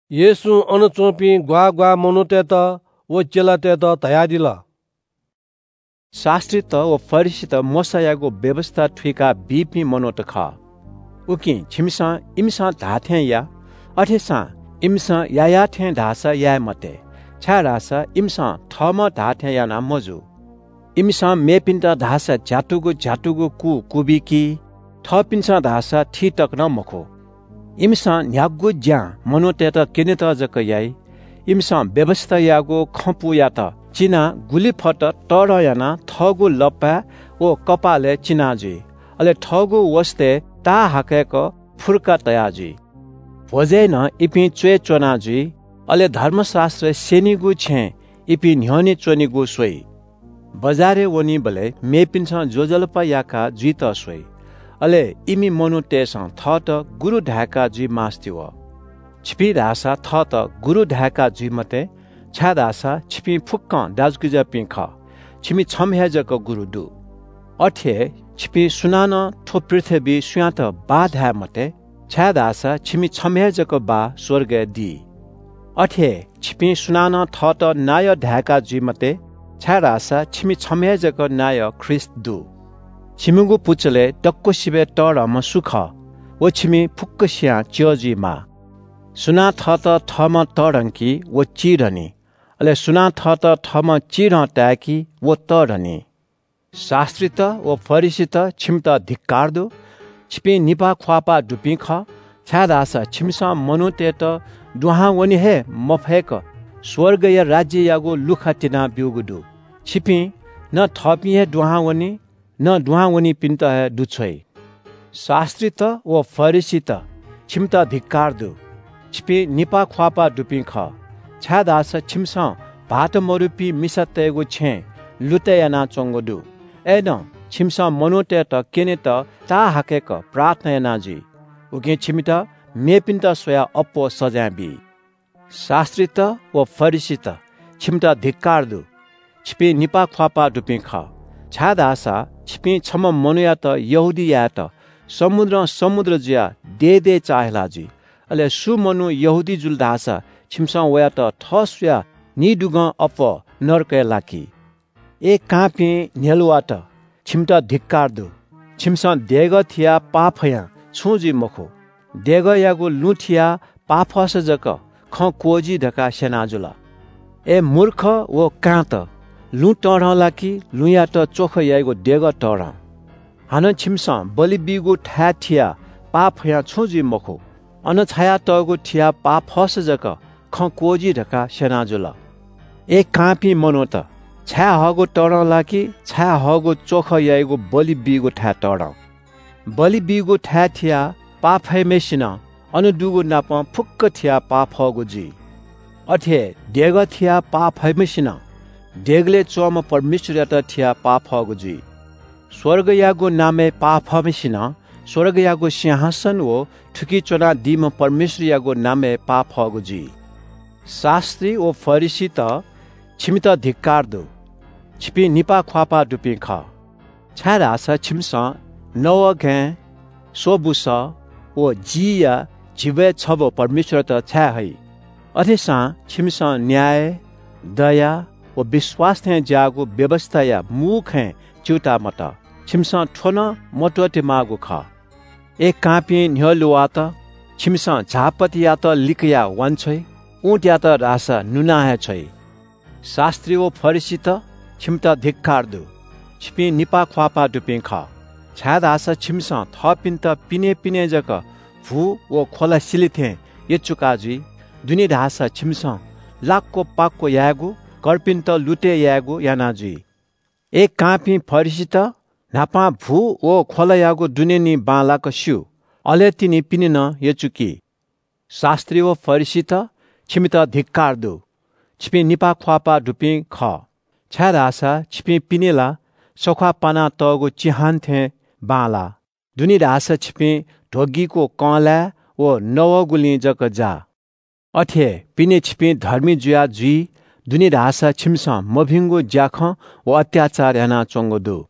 येशूं अन च्‍वंपिं ग्‍वाः ग्‍वाः मनूतय्‌त व चेलातय्‌त धयादिल – “शास्‍त्रीत व फरिसीत मोशायागु व्‍यवस्‍था थुइका बीपिं मनूत खः। उकिं छिमिसं इमिसं धाःथें या। अथेसां इमिसं याःयाः थें धाःसा याये मते, छाय्‌धाःसा इमिसं थःम्‍हं धाःथें याना मजू। इमिसं मेपिन्‍त धाःसा झ्‍यातुगु झ्‍यातुगु कु क्‍वबिकी, थःपिन्‍सं धाःसा थी तक नं मखु। “इमिसं न्‍ह्यागु ज्‍यां मनूतय्‌त क्‍यनेत जक याइ। इमिसं व्‍यवस्‍थायागु खँपुयात चिनाः गुलि फत तःधं यानाः थःगु लप्‍पाय् व कपालय् चिना जुइ। अले थःगु वसतय् ताःहाकय्‌क फुर्का तया जुइ। भ्‍वजय् नं इपिं च्‍वय् च्‍वना जुइ। अले धर्मशास्‍त्र स्‍यनीगु छेँय् इपिं न्‍ह्यःने च्‍वनेगु स्‍वइ। बजारय् वनीबलय् मेपिन्‍सं ज्‍वजलपा याका जुइत स्‍वइ, अले इमि मनूतय्‌सं थःत ‘गुरु’ धाय्‌का जुइ मास्‍ति वः। “छिपिं धाःसा थःत ‘गुरु’ धाय्‌का जुइ मते, छाय्‌धाःसा छिपिं फुक्‍कं दाजुकिजापिं खः, छिमि छम्‍ह हे जक गुरु दु। अथे हे छिपिं सुनानं थ्‍व पृथ्‍वीइ सुयातं ‘बाः’ धाये मते, छाय्‌धाःसा छिमि छम्‍ह हे जक बाः स्‍वर्गय् दी। अथे हे छिपिं सुनानं थःत नायः धायेका जुइ मते, छाय्‌धाःसा छिमि छम्‍ह हे जक नायः ख्रीष्‍ट दु। छिमिगु पुचलय् दक्‍वसिबय् तःधंम्‍ह सु खः, व छिमि फुक्‍कसियां च्‍यः जुइमाः। सुनां थःत थःम्‍हं तःधंकी व चिधंनी। अले सुनां थःत थःम्‍हं चिधं ताय्‌की व तःधंनी।” “शास्‍त्रीत व फरिसीत, छिमित धिक्‍कार दु। छिपिं निपाः ख्‍वाःपाः दुपिं खः, छाय्‌धाःसा छिमिसं मनूतय्‌त दुहां वने हे मफय्‌क स्‍वर्गया राज्‍ययागु लुखा तिनाब्‍यूगु दु। छिपिं न थःपिं हे दुहां वनी, न दुहां वनीपिन्‍त हे दुछ्वइ। शास्‍त्रीत व फरिसीत, छिमित धिक्‍कार दु। छिपिं निपाः ख्‍वाःपाः दुपिं खः, छाय्‌धाःसा छिमिसं भाःत मदुपिं मिसातय्‌गु छेँ लुतय् यानाच्‍वंगु दु। अय्‌नं छिमिसं मनूतय्‌त क्‍यनेत ताःहाकय्‌क प्रार्थना याना जुइ। उकिं छिमित मेपिन्‍त स्‍वयाः अप्‍वः सजाँय बी। “शास्‍त्रीत व फरिसीत, छिमित धिक्‍कार दु। छिपिं निपाः ख्‍वाःपाः दुपिं खः, छाय्‌धाःसा छिपिं छम्‍ह मनूयात यहूदी यायेत समुद्रं समुद्रं जुयाः दे दे चाःहिला जुइ। अले सुं मनू यहूदी जुल धाःसा छिमिसं वयात थः स्‍वयाः निदुगं अप्‍वः नरकय् लाकी। “अय् कांपिं न्‍ह्यलुवाःत, छिमित धिक्‍कार दु। छिमिसं देगः थियाः पाफयां छुं जुइ मखु, देगःयागु लुँ थियाः पाफसा जक खँ क्‍वःजी धकाः स्‍यना जुल। अय् मूर्ख व कांत, लुँ तःधं ला कि लुँयात च्‍वख याइगु देगः तःधं? हानं छिमिसं बलि बीगु थाय् थियाः पाफयां छुं जुइ मखु, अन छायातःगु थियाः पाफसा जक खँ क्‍वःजी धकाः स्‍यना जुल। अय् कांपिं मनूत, छायेहःगु तःधं ला कि छायेहःगु च्‍वख याइगु बलि बीगु थाय् तःधं? बलि बीगु थाय् थियाः पाफम्‍हय्‌सिनं अन दुगुनापं फुक्‍क थियाः पाफःगु जुइ। अथे हे देगः थियाः पाफम्‍हय्‌सिनं देगलय् च्‍वंम्‍ह परमेश्‍वरयात थियाः पाफःगु जुइ। स्‍वर्गयागु नामय् पाफम्‍हय्‌सिनं स्‍वर्गयागु सिंहासन व थुकी च्‍वनादीम्‍ह परमेश्‍वरयागु नामय् पाफःगु जुइ। “शास्‍त्री व फरिसीत, छिमित धिक्‍कार दु। छिपिं निपाः ख्‍वाःपाः दुपिं खः, छाय्‌धाःसा छिमिसं नवःघाँय्, सोँप व जीया झिब्‍वय् छब्‍व परमेश्‍वरयात छाये हइ। अथेसां छिमिसं न्‍याय, दया व विश्‍वास थें ज्‍याःगु व्‍यवस्‍थाया मू खँय् च्‍यूताः मतः। छिमिसं थ्‍व नं मत्‍वःते माःगु खः। अय् कांपिं न्‍ह्यलुवाःत, छिमिसं झाःपत्तियात लिकयाः वांछ्वइ। उँटयात धाःसा नुना हे छ्वइ। “शास्‍त्री व फरिसीत, छिमित धिक्‍कार दु। छिपिं निपाः ख्‍वाःपाः दुपिं खः, छाय्‌धाःसा छिमिसं थःपिन्‍त पिनें पिनें जक भु व ख्‍वला सिले थें यचुका जुइ। दुने धाःसा छिमिसं लाक्‍व पाक्‍व यायेगु, कर्पिन्‍त लुतय् यायेगु याना जुइ। अय् कांपिं फरिसीत, न्‍हापां भु व ख्‍वलाया दुने निं बांलाक स्‍यू। अले तिनि पिने नं यचुकी। “शास्‍त्री व फरिसीत, छिमित धिक्‍कार दु। छिपिं निपाः ख्‍वाःपाः दुपिं खः, छाय्‌धाःसा छिपिं पिने ला सख्‍वाः पानातःगु चिहान थें बांलाः। दुने धाःसा छिपिं ध्‍वगीगु कँलाय् व नवःगुलिं जक जाः। अथे हे पिने छिपिं धर्मी जुया जुइ, दुने धाःसा छिमिसं मभिंगु ज्‍याखँ व अत्‍याचार यानाच्‍वंगु दु।”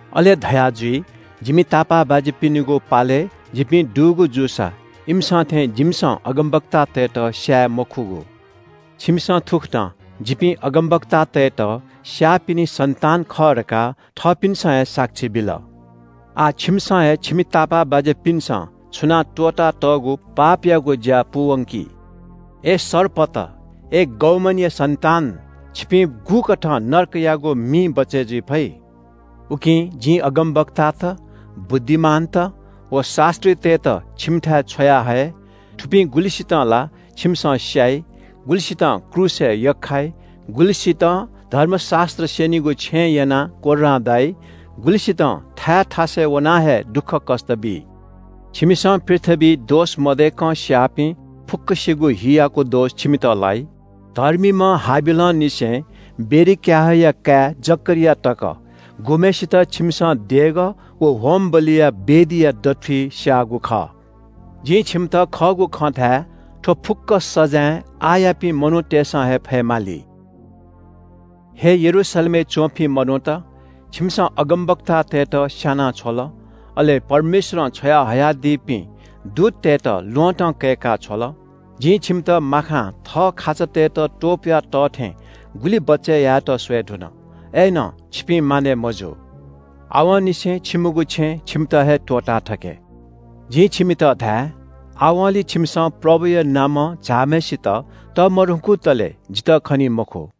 अले धयाजुइ – ‘जिमि तापाःबाज्‍यापिनिगु पालय् जिपिं दुगु जूसा इमिसं थें जिमिसं अगमवक्तातय्‌त स्‍याये मखुगु।’ “छिमिसं थुकथं ‘जिपिं अगमवक्तातय्‌त स्‍याःपिनि सन्‍तान खः’ धकाः थःपिन्‍सं हे साक्षी बिल। आः छिमिसं हे छिमि तापाःबाज्‍यापिन्‍सं छुनाः त्‍वःतातःगु पापयागु ज्‍या पूवंकि। अय् सर्पत, अय् बिख दुम्‍ह सर्पया सन्‍तान, छिपिं गुकथं नरकयागु मिं बचय् जुइ फइ? “उकिं जिं अगमवक्तात, बुद्धिमानत व शास्‍त्रीतय्‌त छिमिथाय् छ्वयाहये। थुपिं गुलिसितं ला छिमिसं स्‍याइ, गुलिसितं क्रूसय् यख्‍खाइ, गुलिसितं धर्मशास्‍त्र स्‍यनीगु छेँय् यनाः कोर्रां दाइ, गुलिसितं थाय् थासय् वनाः हे दुःखकष्‍ट बी। छिमिसं पृथ्‍वीइ दोष मदय्‌कं स्‍याःपिं फुक्‍कसिगु हियागु दोष छिमित लाइ। धर्मीम्‍ह हाबिलंनिसें बेरेक्‍याहया काय् जकरिया तक, गुम्‍हय्‌सित छिमिसं देगः व होमबलिया वेदीया दथुइ स्‍याःगु खः। जिं छिमित खःगु खँ धाये – थ्‍व फुक्‍क सजाँय आःयापिं मनूतय्‌सं हे फयेमाली।” “हे यरूशलेमय् च्‍वंपिं मनूत, छिमिसं अगमवक्तातय्‌त स्‍याना छ्वल, अले परमेश्‍वरं छ्वयाहयादीपिं दूततय्‌त ल्‍वहँतं कय्‌का छ्वल। जिं छिमित माखां थः खाचातय्‌त त्‍वपुया तः थें गुलि बचय् यायेत स्‍वये धुन। अय्‌नं छिपिं मानय् मजू। आवंनिसें छिमिगु छेँ छिमित हे त्‍वःताथके। जिं छिमित धाये – आवंलि छिमिसं प्रभुया नामं झाःम्‍हय्‌सित तःमधंकुतले जितः खनी मखु।”